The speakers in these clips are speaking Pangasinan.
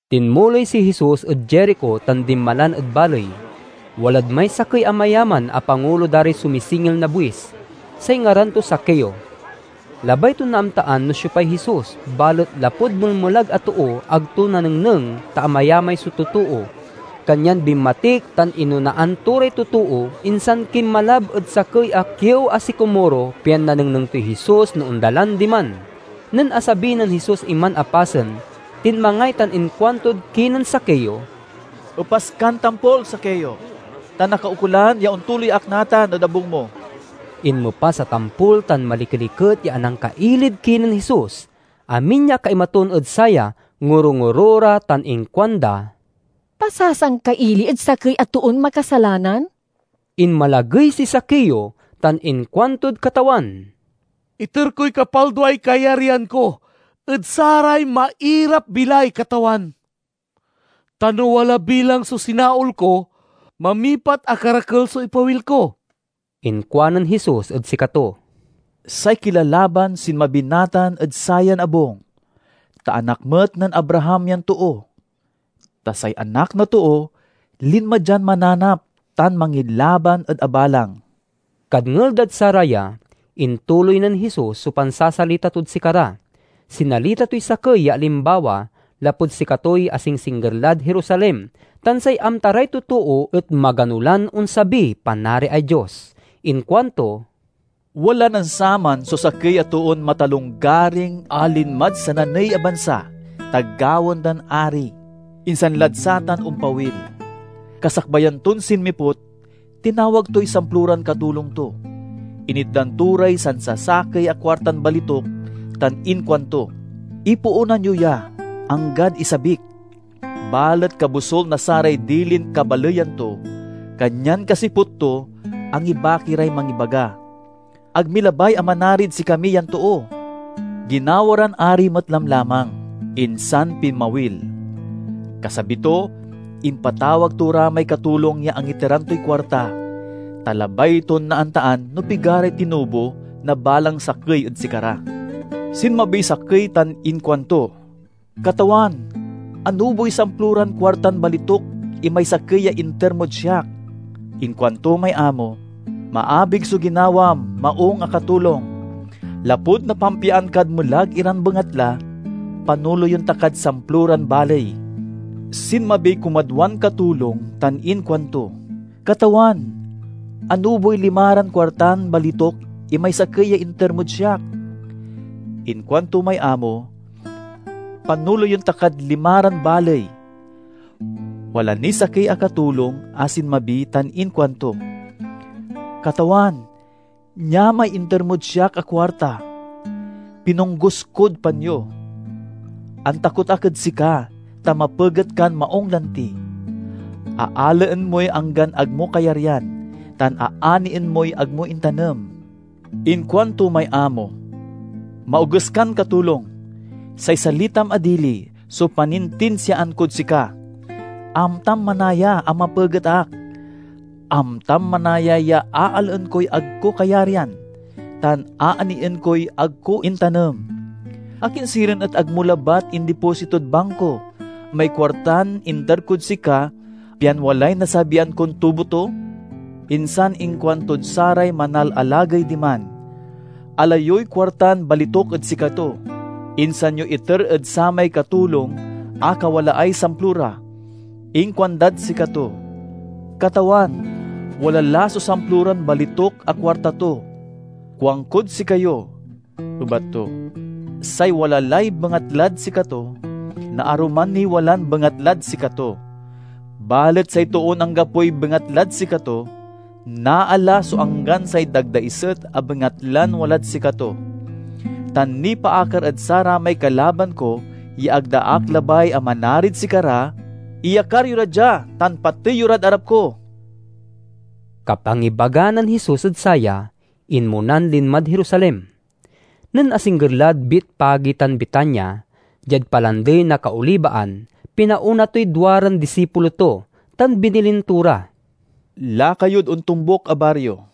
Tinmuloy si Jesus ed Jerico tan dinmalan ed baley. Walad may sakey a mayaman a pangulo da ray sumisingil na buis; say ngaran to Zaqueo. Labay ton naamtaan no siopay Jesus, balet lapud melmelag a too ag to nanengneng, ta amayamay so totoo. Kanyan binmatik tan inonaan to ray totoo, insan kinmalab ed sakey a kiew a sikomoro pian nanengneng toy Jesus no ondalan diman. Nen asabi nen Jesus iman a pasen, tinmangay tan inkuantod kinen Zaqueo, "Epas kan tampol, Zaqueo, ta nakaukolan ya ontuloy ak natan ed abung mo." Inmepas a tampol tan malikeliket ya anangkailid kinen Jesus. Amin ya akaimatun ed saya ngoro-ngoro ra tan inkuanda, "Pasasangkaili ed sakey a toon makasalanan!" Inmalagey si Zaqueo tan inkuantod Katawan, "Iter koy kapalduay kayaryan ko ed saray mairap-bilay, Katawan; tan no wala bilang so sinaol ko, mamipat a karakel so ipawil ko." Inkuanen Jesus ed sikato, "Say kilalaban sinmabi natan ed sayan abung, ta anak met nen Abraham yan too. Ta say Anak na Too linma dian mananap tan mangilaban ed abalang." Kadngel dad saraya, intuloy nen Jesus so pansasalita tod sikara. Sinalita toy sakey ya alimbawa, lapud sikatoy asingsingger lad Jerusalem tan say amta ray totoo et magano lan onsabiy Panariay Dios. Inkuanto, "Wala nen saman so sakey a toon matalonggaring a linmad sananey a bansa ta gawaen dan ari, insan lad satan ompawil. Kasakbayan ton sinmiput, tinawag toy samploran katulong to, initdan to ray sansasakey a kuartan balituk tan inkuanto, 'Ipoonan yo ya, anggad isabik!' Balet kabosul na saray dilin kabaleyan to, kanyan kasiput to, angibaki ray mangibaga, 'Ag mi labay a manarid sikami yan too.' "Ginawa ran ari met lamlamang, insan pinmawil. Kasabi to, impatawag to ra may katulong ya angiteran toy kuarta, ta labay ton naamtaan no pigaray tinubo na balang sakey ed sikara. Sinmabiy sakey tan inkuanto, 'Katawan, anuboy samploran kuartan balituk imay sakey ya inter mod siak.' Inkuanto may amo, 'Maabig so ginawam, maung a katulong! Lapud napampiaan kad melag iran bengatla, panoleyen ta kad samploran baley.' Sinmabiy kumadwan katulong tan inkuanto, 'Katawan, anuboy limaran kuartan balituk imay sakey ya inter mod siak.' Inkuanto may amo, 'Panoleyen ta kad limaran baley.' Wala niy sakey a katulong a sinmabi tan inkuanto, 'Katawan, nia may inter mod siak a kuarta. Pinonggus kod panyo. Antakot ak ed sika, ta mapeget kan maung lanti. Aalaen moy anggan ag mo kayaryan, tan aanien moy ag mo intanem.' Inkuanto may amo, 'Maoges kan katulong! Say salitam a dili so panintinsiaan kod sika! Amtam manaya a mapeget ak. Amtam manaya ya aalaen koy ag ko kayaryan, tan aanien koy ag ko intanem. Akin sirin et ag mo labat indipositod bangko may kuartan inter kod sika, pian walay nasabian kon tubo to?' Insan inkuantod saray manalalagey diman, 'Ala yoy kuartan balituk ed sikato, insan yo iter ed samay katulong a kawalaay samplora.' Inkuandad sikato, 'Katawan, wala la so samploran balituk a kuarta to!' 'Kuankod sikayo,' ebat to, 'say wala lay bengatlad sikato, naaruman niy walan bengatlad sikato; balet say toon anggapoy bengatlad sikato, naala so anggan say dagdaiset a bengatlan walad sikato. Tan nipaakar ed saramay kalaban ko ya ag da ak labay a manarid sikara: iyakar yo ra dia tan patey yo rad arap ko!'" Kapangibaga nen Jesus ed saya, inmonan linmad Jerusalem. Nen asingger lad Betfage tan Betania, diad Palandey na Kaolibaan, pinaona toy duaran disipulo to, tan binilin to ra, "Laka yod ontombuk a bario.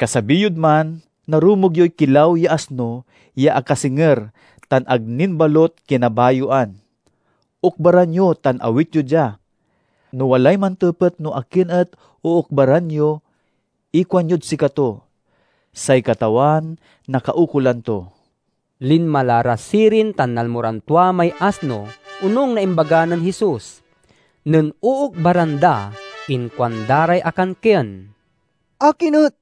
Kasabi yod man, narumog yoy kilaw ya asno ya akasinger tan ag nin balut kinabayoan. Okbaran yo tan awit yo dia. No walay mantepet no akin et ookbaran yo, ikuanyod sikato, 'Say Katawan nakaukolan to.'" Linma la ra sirin tan nalmo ran tua may asno, onung na imbaga nen Jesus. Nen ookbaran da, inkuanda ray akankien, "Akin et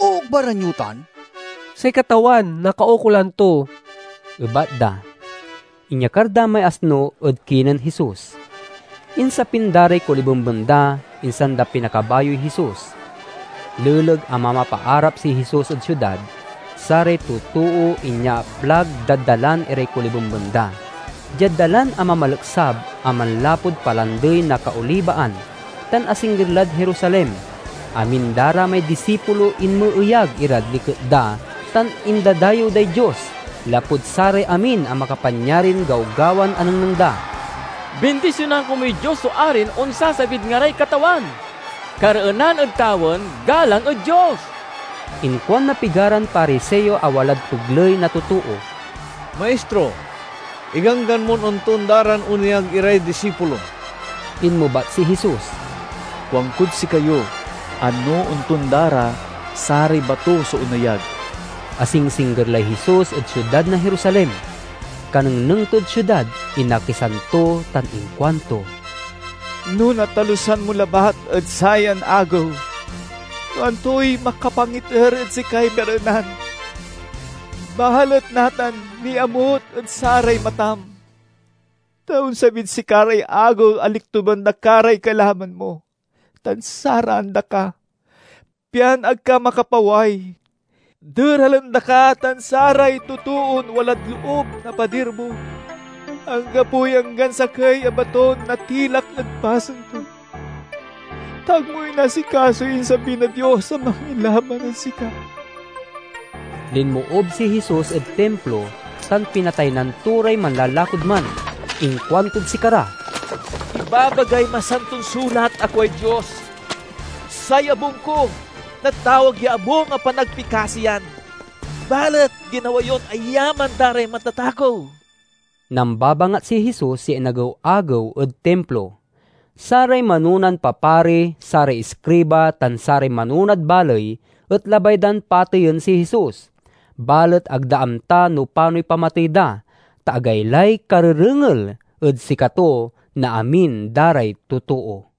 ookbaran yo tan?" "Say Katawan nakaukolan to," ebat da. Inyakar da may asno ed kinen Jesus. Insapin da ray kolibemben da, insan da pinakabayoy Jesus. Leleg a mamapaarap si Jesus ed siudad, saray totoo inyaaplag dad dalan iray kolibemben da. Diad dalan a mamaleksab a manlapud Palandey na Kaolibaan, tan asingger lad Jerusalem, amin da ra may disipulo inmeeyag irad liket da tan indadayew day Dios, lapud saray amin a makapanyarin gawgawan anengneng da: "Bindisionan komuy Dios so arin onsasabid ngaray Katawan! Kareenan ed tawen! Galang ed Dios!" Inkuan na pigaran Pariseo a walad pegley na totoo, "Maistro, iganggan mon ontonda ran oneyag iray disipulom!" Inmebat si Jesus, "Kuankod sikayo a no ontonda ra, saray bato so oneyag." Asingsingger lay Jesus ed siudad na Jerusalem. Kanengneng tod siudad inakisan to tan inkuanto, "No natalusan mo labat ed sayan agew no antoy makapangiter ed sikay kareenan! Balet natan niamut ed saray matam! Ta onsabid sika ray agew a liktuben da ka ray kalaban mo tan saraan da ka, pian ag ka makapaway. Deralen da ka tan saray totoon walad loob na padir mo. Anggapoy anggan sakey a baton natilak ed pasen to, ta ag mo inasikasoy insabi na Dios a mangilaban ed sika!" Linmoob si Jesus ed Timplo tan pinataynan to ray manlalakod man. Inkuantod sikara, "Ibabagay Masanton Sulat a kuay Dios, 'Say abung ko natawag ya abung a panagpikasiyan!' Balet ginawa yon ayaman da ray matatakew!" Nambabangat si Jesus ya inagew-agew ed Timplo. Saray manonan papari, saray iskriba, tan saray manonad baley et labay dan pateyen si Jesus. Balet ag da amta no panoy pamatey da, ta agaylay karerengel ed sikato na amin da ray totoo.